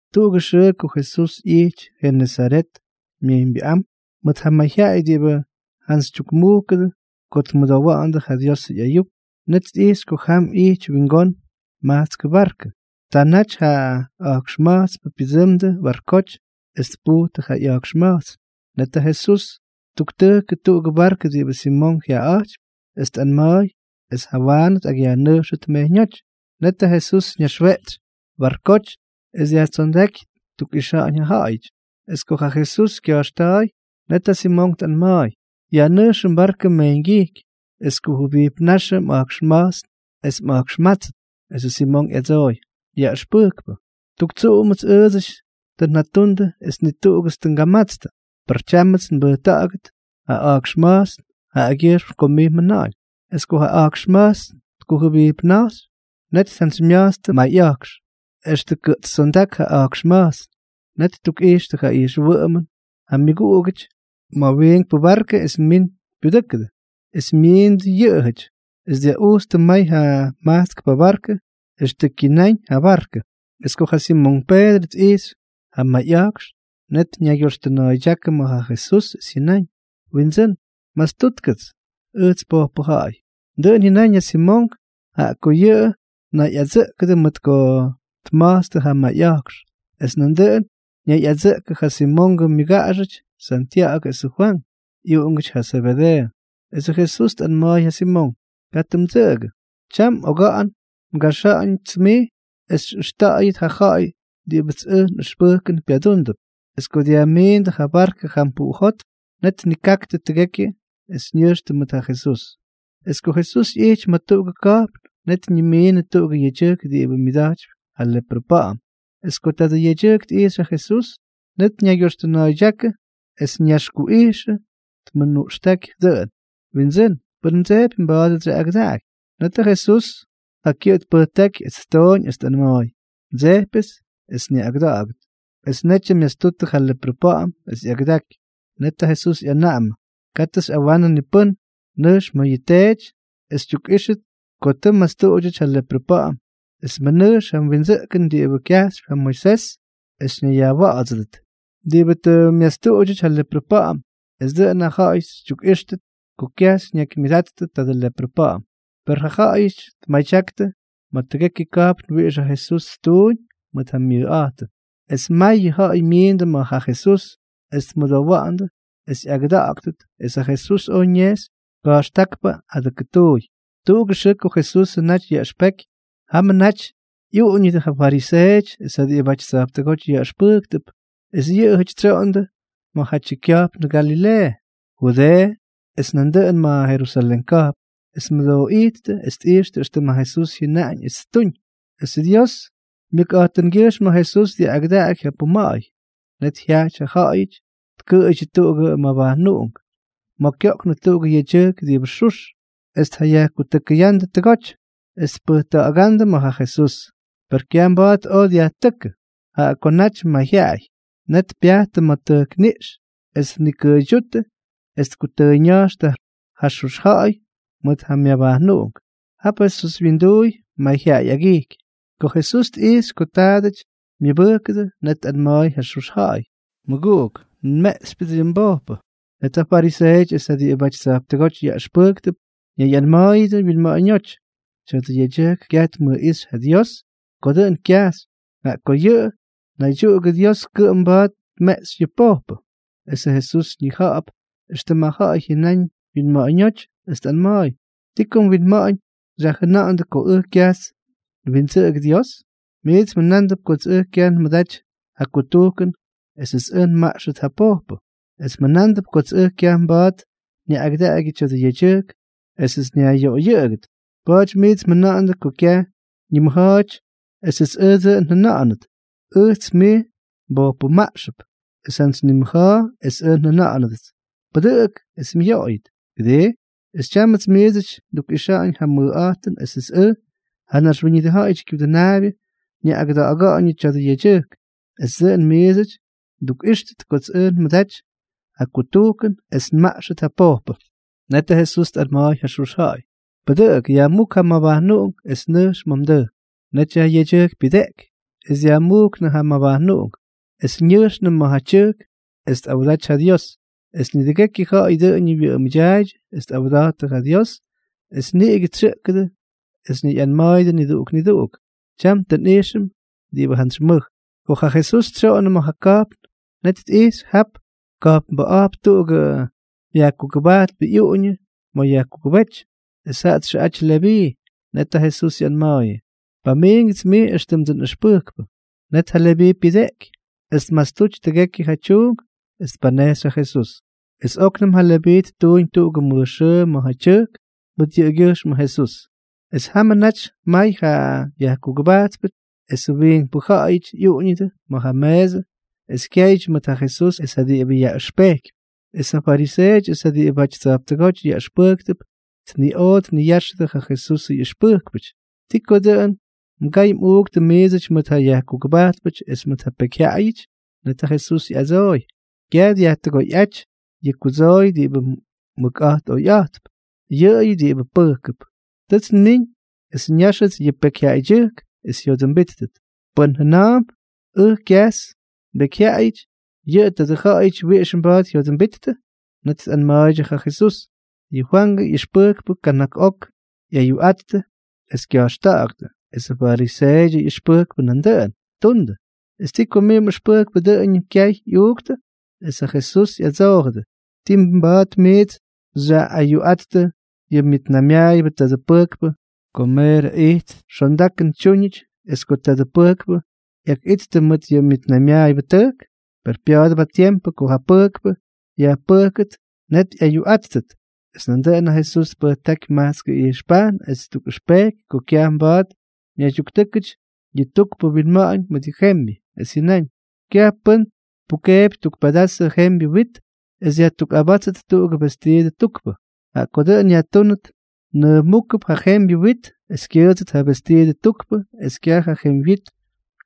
Tuꞌugʉ xʉʉ ko Jesús ꞌyijty Jenesaret Myejyñbyʉꞌám mʉʉt ja mayjyaꞌay diꞌibʉ jantsytyukmujkʉdʉ ko tmʉdowa̱ꞌa̱ndʉ ja Diosʉ ꞌyayuk, net tꞌijxy ko jam ꞌyity wingón majtskʉ barkʉ. Ta naty ja a̱jkxma̱jtspʉ pyʉdsʉmdʉ barkoty es tpujtʉ ja ꞌya̱jkxma̱jtsn. Net ja Jesús ttuktʉjkʉ tuꞌugʉ barkʉ diꞌibʉ Simonk jyaꞌaꞌa̱jtypy, es tꞌanma̱a̱y es jawaanʉ tꞌakꞌyajnʉjxʉt mejyñóty. Net ja Jesús ñaxweꞌtsy barkoty, es dyajtsondáky ttukꞌixa̱ꞌa̱ñ ja ja̱ꞌa̱yʉty. Es ko ja Jesús kya̱jxta̱a̱y, net ja Simonk tꞌanma̱a̱y: —Yajnʉjxʉ mbarkʉ mejyñgyijky, es kujʉbijpnáxʉ mꞌa̱jkxma̱jtsn es mꞌa̱jkxmátsʉt. Esʉ Simonk ꞌyadsooy: —Yaꞌʉxpʉjkpʉ, tuk tsuꞌumʉts ʉʉdsʉty tʉ njatundʉ es ni tuꞌugʉts tʉ ngamatstʉ. Per tyámʉts nbʉjta̱ꞌa̱gʉt ja a̱jkxma̱jtsn yʉꞌʉgyʉjxm ko mij mjʉna̱ꞌa̱ñ. Es ko ja a̱jkxma̱jtsn tkujʉbijpna̱jxy, net tjantsymya̱jtstʉ mayꞌa̱jkx, extʉ kʉꞌtstsondák ja a̱jkxma̱jtsn. Net ttukꞌijxtʉ ja ijxwʉꞌʉmʉn ja myʉguꞌugʉty ma̱ ja wiinkpʉ barkʉ es min pyudʉ́kʉdʉ. Es myiindʉ yʉꞌʉjʉty, es dyaꞌujtstʉ may ja majtskpʉ barkʉ extʉ kyináñ ja byarkʉ. Es ko ja Simonk Peedrʉ tꞌijxy ja mayꞌa̱jkx, net ñaygyoxtʉna̱a̱ydyákʉ ma̱ ja Jesús es jyʉnáñ: —Windsʉ́n, mastútkʉts, ¡ʉjts pojpʉ ja̱ꞌa̱y! Dʉꞌʉn jyʉnáñ ja Simonk, jaꞌa ko yʉꞌʉ ñayꞌadsʉꞌkʉdʉ mʉt ko tma̱jtstʉ ja mayꞌa̱jkx. Es nandʉꞌʉn ñayꞌadsʉꞌkʉdʉ ja Simongʉ myʉguꞌugʉty Santya̱ꞌa̱gʉ es ja Fwank, ꞌyuꞌungʉty ja Zebedeeʉ. Esʉ Jesús tꞌanma̱a̱y ja Simonk: —Katʉ mdsʉꞌʉgʉ. Tyam oga̱ꞌa̱n ngaxa̱ꞌa̱ñʉts mij es xyꞌʉxta̱ꞌa̱yʉt ja ja̱ꞌa̱y diꞌibʉts ʉjʉ nꞌʉxpʉjkʉn pyadúndʉp. Es ko dyajmiindʉ ja barkʉ jam puꞌujótm, net tnikaktʉ tʉgekyʉ es ñʉjxtʉ mʉt ja Jesús. Es ko Jesús ꞌyijty ma̱ tuꞌugʉ ka̱jpn, net ñimiinʉ tuꞌugʉ yedyʉjk diꞌibʉ myʉda̱jtypy ja leprʉ pa̱ꞌa̱m. Es ko tadʉ yedyʉjk tꞌijxy ja Jesús, net ñaygyoxtʉna̱a̱ydyákʉ es ñaxkuꞌijxʉ es tmʉnuꞌxtáky dʉꞌʉn: —Windsʉ́n, pʉn mdsejpy, mba̱a̱dʉts xyaꞌꞌagʉdaꞌaky. Net ja Jesús ja kyʉꞌʉ tpʉjtáky es ttooñ es tꞌanma̱a̱y: —Ndsejpyʉts es nyaꞌꞌagʉda̱ꞌa̱gʉt. Es netyʉ myastutʉ ja leprʉ pa̱ꞌa̱m es ꞌyagʉdaky. Net ja Jesús ꞌyanaꞌamʉ: —Katʉ xyꞌawanʉ ni pʉ́n. Nʉjx ma̱ yʉ teety es xytyukꞌíxʉt ko tʉ mmastuꞌudyʉty ja leprʉ pa̱ꞌa̱m. Es mʉnʉjx ja windsʉꞌkʉn diꞌibʉ kyajxypy ja Moisés es ñayyajwa̱ꞌa̱dsʉdʉt diꞌibʉ tʉ myastuꞌudyʉty ja leprʉ pa̱ꞌa̱m. Es dʉꞌʉn ja ja̱ꞌa̱y xytyukꞌíxtʉt ko kyaj xyñakymyʉdatyʉ tadʉ leprʉ pa̱ꞌa̱m. Per ja ja̱ꞌa̱yʉty tmadyaktʉ ma̱ tʉgekyʉ ka̱jpn wiꞌix ja Jesús ttuuñ mʉt ja myʉjꞌa̱jtʉn, es mayʉ ja̱ꞌa̱y myiindʉ ma̱ ja Jesús es tmʉdowa̱ꞌa̱ndʉ es yaꞌꞌagʉda̱ꞌa̱gʉdʉt. Es ja Jesús oj ñejxy ka̱jxtákpʉ adʉkʉtuuy. Tuꞌugʉ xʉʉ ko Jesusʉ naty yaꞌʉxpeky, jamʉ naty ꞌyuꞌuñʉdʉ ja fariseeʉty es ja diꞌibʉty tsa̱jptʉgóty yaꞌʉxpʉjktʉp. Es yʉꞌʉjʉty tsyoꞌondʉ ma̱jatyʉ kya̱jpnꞌuꞌungʉ Galileeʉ, Judeeʉ, es nandʉꞌʉnʉ ma̱ Jerusalén ka̱jpn, es tmʉdooꞌíttʉ es tꞌixtʉ éxtʉm ja Jesús jyʉnaꞌañ es ttuñ. Esʉ Dios myʉkꞌa̱jtʉngyʉjxm ja Jesús dyaꞌꞌagʉdaky ja puma̱ꞌa̱y. Net jyajty ja ja̱ꞌa̱yʉty tkʉꞌʉydyʉ tuꞌugʉ mabajnuꞌunk ma̱ kyoꞌknʉ tuꞌugʉ yedyʉjk diꞌibʉ xux. Es tjayajtʉkʉyándʉ tʉgoty es tpʉjta̱ꞌa̱gándʉ ma̱ ja Jesús. Per kyaj mba̱a̱t oj dyajtʉ́kʉ, jaꞌa ko naty mayjyaꞌay. Net pyajttʉ ma̱ tʉjkniꞌx es tnikʉʉydyúttʉ es tkutʉʉyña̱jxtʉ ja xux ja̱ꞌa̱y mʉt ja myabajnuꞌunk jap Jesús winduuy mayjyaꞌay agijky. Ko Jesús tꞌijxy ko taadʉty myʉbʉjkʉdʉ, net tꞌanma̱a̱y ja xux ja̱ꞌa̱y: —Mʉguꞌuk, nmeꞌxypyʉts yʉ mbojpʉ. Net ja fariseeʉty es ja diꞌibʉty tsa̱jptʉgóty yaꞌʉxpʉjktʉp ñayꞌanma̱a̱yʉdʉ wyinma̱ꞌa̱ñóty: “Tya̱dʉ yedyʉjk kyaj tmʉjꞌíxy ja Dios ko dʉꞌʉn kyajxy, jaꞌa ko yʉꞌʉ naydyuꞌugʉ Dios kʉꞌʉm mba̱a̱t tmeꞌxy yʉ pojpʉ.” Esʉ Jesús ñija̱ꞌa̱p éxtʉm ja ja̱ꞌa̱y jyʉnáñ wyinma̱ꞌa̱ñóty, es tꞌanma̱a̱y: —¿Ti ko mwinma̱ꞌa̱ñ xyajjʉna̱ꞌa̱ndʉ ko ʉj kyajts nwindsʉꞌʉgʉ Dios? Miits mjʉnándʉp kots ʉj kyaj nmʉdaty ja kutujkʉn esʉts ʉj nmaꞌxʉt yʉ pojpʉ. Es mjʉna̱a̱mp kots ʉj kyaj mba̱a̱t nyaꞌꞌagʉdaꞌagyʉ tya̱dʉ yedyʉjk esʉts nyajꞌyoꞌoyʉꞌʉgʉt. Pa̱a̱ty miits mjʉna̱ꞌa̱ndʉ ko kyaj ñimʉja̱a̱ty esʉts ʉj dʉꞌʉn njʉna̱ꞌa̱nʉt: “Ʉjts mij nbojpʉmaꞌxʉp.” Es jantsy nimʉja̱a̱ es ʉj njʉna̱ꞌa̱nʉdʉts: “Pʉdʉꞌʉk es myoꞌoyʉt”, ¿kʉdii? Es tyámʉts miidsʉty ndukꞌixa̱ꞌa̱ñ ja nmʉjꞌa̱jtʉn esʉts ʉj, ja Naxwíñʉdʉ Ja̱ꞌa̱yʉdyʉ Kyudʉnaabyʉ, nyaꞌꞌagʉda̱ꞌa̱ga̱ꞌa̱ñʉ tadʉ yedyʉjk es dʉꞌʉn miidsʉty ndukꞌíxʉt kots ʉj nmʉdaty ja kutujkʉn esʉts nmaꞌxʉt ja pojpʉ. Net ja Jesús tꞌanma̱a̱y ja xux ja̱ꞌa̱y: —Pʉdʉꞌʉk, yajmúk ja mmabajnuꞌunk es nʉjx ma̱ mdʉjk. Netyʉ ja yedyʉjk pyʉdeꞌky es dyajmujknʉ ja mabajnuꞌunk es ñʉjxnʉ ma̱ tyʉjk es tꞌawda̱jty ja Dios. Es nidʉgekyʉ ja̱ꞌa̱y dʉꞌʉñʉ wyʉꞌʉmʉdyaaydyʉ es tꞌawda̱jttʉ ja Dios, es niꞌigʉ tsyʉꞌkʉdʉ es ñayꞌanma̱a̱yʉdʉ niduꞌuk niduꞌuk: —Tyam tʉ nꞌijxʉm diꞌibʉty jantsy mʉj. Ko ja Jesús tsyoꞌonnʉ ma̱ ja ka̱jpn, net tꞌijxy jap ka̱jpnbʉꞌa̱jp tuꞌugʉ yajkugʉbajtpʉ ꞌyuꞌuñʉ ma̱ yajkugʉbéty, es jaꞌa txʉꞌaty Leví. Net ja Jesús ꞌyanma̱a̱yʉ: —Pamiingʉts mij éxtʉmdsʉ nꞌʉxpʉjkpʉ. Net ja Leví pyʉdeꞌky, es tmastuty tʉgekyʉ ja tyuunk es tpanejxy ja Jesús. Es óknʉm ja Leví ttuuñ tuꞌugʉ mʉj xʉʉ ma̱ ja tyʉjk mʉt yʉꞌʉgyʉjxmʉ Jesús. Es jamʉ naty may ja yajkugʉbajtpʉ esʉ wiinkpʉ ja̱ꞌa̱yʉty ꞌyuꞌuñʉdʉ ma̱ ja meesʉ es kyaydyʉ mʉt ja Jesús es ja diꞌibʉ yaꞌʉxpejkypy. Es ja fariseeʉty es ja diꞌibʉty tsa̱jptʉgóty yaꞌʉxpʉjktʉp tniꞌoꞌo tniyáxʉdʉ ja Jesusʉ ꞌyʉxpʉjkpʉty: —¿Ti ko dʉꞌʉn mgay mꞌuuktʉ miidsʉty mʉt ja yajkugʉbajtpʉty es mʉt ja pekyjyaꞌayʉty? Net ja Jesús ꞌyadsooy: —Kyaj dyajtʉgoyꞌáty yʉ kudsooy diꞌibʉ mʉkꞌa̱jt oyꞌa̱jtp, yʉꞌʉyʉ diꞌibʉ pʉjkʉp. Tʉts nmiñ es nyáxʉts yʉ pekyjyaꞌaydyʉjk es jyodʉmbíttʉt. Pʉ́n jʉna̱a̱mp: “Ʉj kyajts mbekyjyaꞌayʉty”, ¿yʉ tadʉ ja̱ꞌa̱yʉty wiꞌix mba̱a̱t jyodʉmbittʉ? Net tꞌanma̱a̱ydyʉ ja Jesús: —Yʉ Fwangʉ ꞌyʉxpʉjkpʉ kana̱k ok ꞌyayuꞌattʉ es kya̱jxta̱ꞌa̱ktʉ. Es ja fariseeʉdyʉ ꞌyʉxpʉjkpʉ nandʉꞌʉn ttundʉ. ¿Es ti ko mij mꞌʉxpʉjkpʉ dʉꞌʉñʉm kyay ꞌyuuktʉ? Es ja Jesús ꞌyadsoojʉdʉ: —¿Ti mba̱a̱t miits xyaꞌꞌayuꞌattʉ yʉ myʉtnaymyaayʉbʉ tadʉ pʉjkpʉ ko meerʉ ijt xondakʉn tyúñʉty es ko tadʉ pʉjkpʉ ꞌyakꞌittʉ mʉt ja myʉtnaymyaayʉbʉtʉjk? Per pya̱a̱dʉp ja tiempʉ ko ja pʉjkpʉ yajpʉjkʉt, net ꞌyayuꞌáttʉt. Es nandʉꞌʉn ja Jesús tpʉjtáky majtskʉ ijxpajtʉn es ttukꞌʉxpejky ko kyaj mba̱a̱t ñaydyuktʉ́kʉty yʉ tukpʉ winma̱ꞌa̱ñ mʉt ja jembyʉ. Es jyʉnáñ: —Kyaj pʉ́n tpukeepy tuk pedazʉ jembyʉ wit es yajtukꞌabátsʉt tuꞌugʉ vestiidʉ tukpʉ. Jaꞌa ko dʉꞌʉn yajtúnʉt, nʉʉmujkp ja jembyʉ wit es kyʉʉdsʉt ja vestiidʉ tukpʉ es kyaj ja jemywyit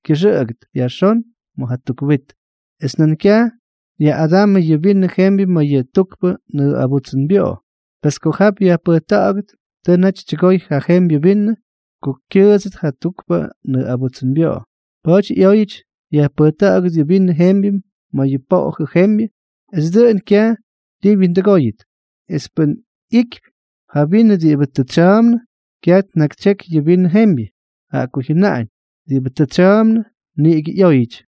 kyʉxʉꞌʉgʉt yajxón ma̱ ja tuk wit. ’Es nan kyaj yaꞌꞌadamʉ yʉ vinʉ jembyʉ ma̱ yʉ tukpʉ nʉʉꞌabutsʉnbyoꞌo. Pes ko jap yajpʉjta̱ꞌa̱gʉt, tʉ naty tyʉgoy ja jembyʉ vinʉ ko kyʉʉdsʉt ja tukpʉ nʉʉꞌabutsʉnbyoꞌo. Pa̱a̱ty ꞌyóyʉty yajpʉjta̱ꞌa̱gʉt yʉ vinʉ jembyʉ ma̱ yʉ poꞌojʉ jembyʉ es dʉꞌʉn kyaj ti wyindʉgóyʉt. Es pʉ́n ꞌyikypy ja vinʉ diꞌibʉ tʉ tsya̱a̱mnʉ, kyaj tnakytsyeky yʉ vinʉ jembyʉ, jaꞌa ko jyʉnaꞌañ: “Diꞌibʉ tʉ tsya̱a̱mnʉ niꞌigʉ ꞌyóyʉty.”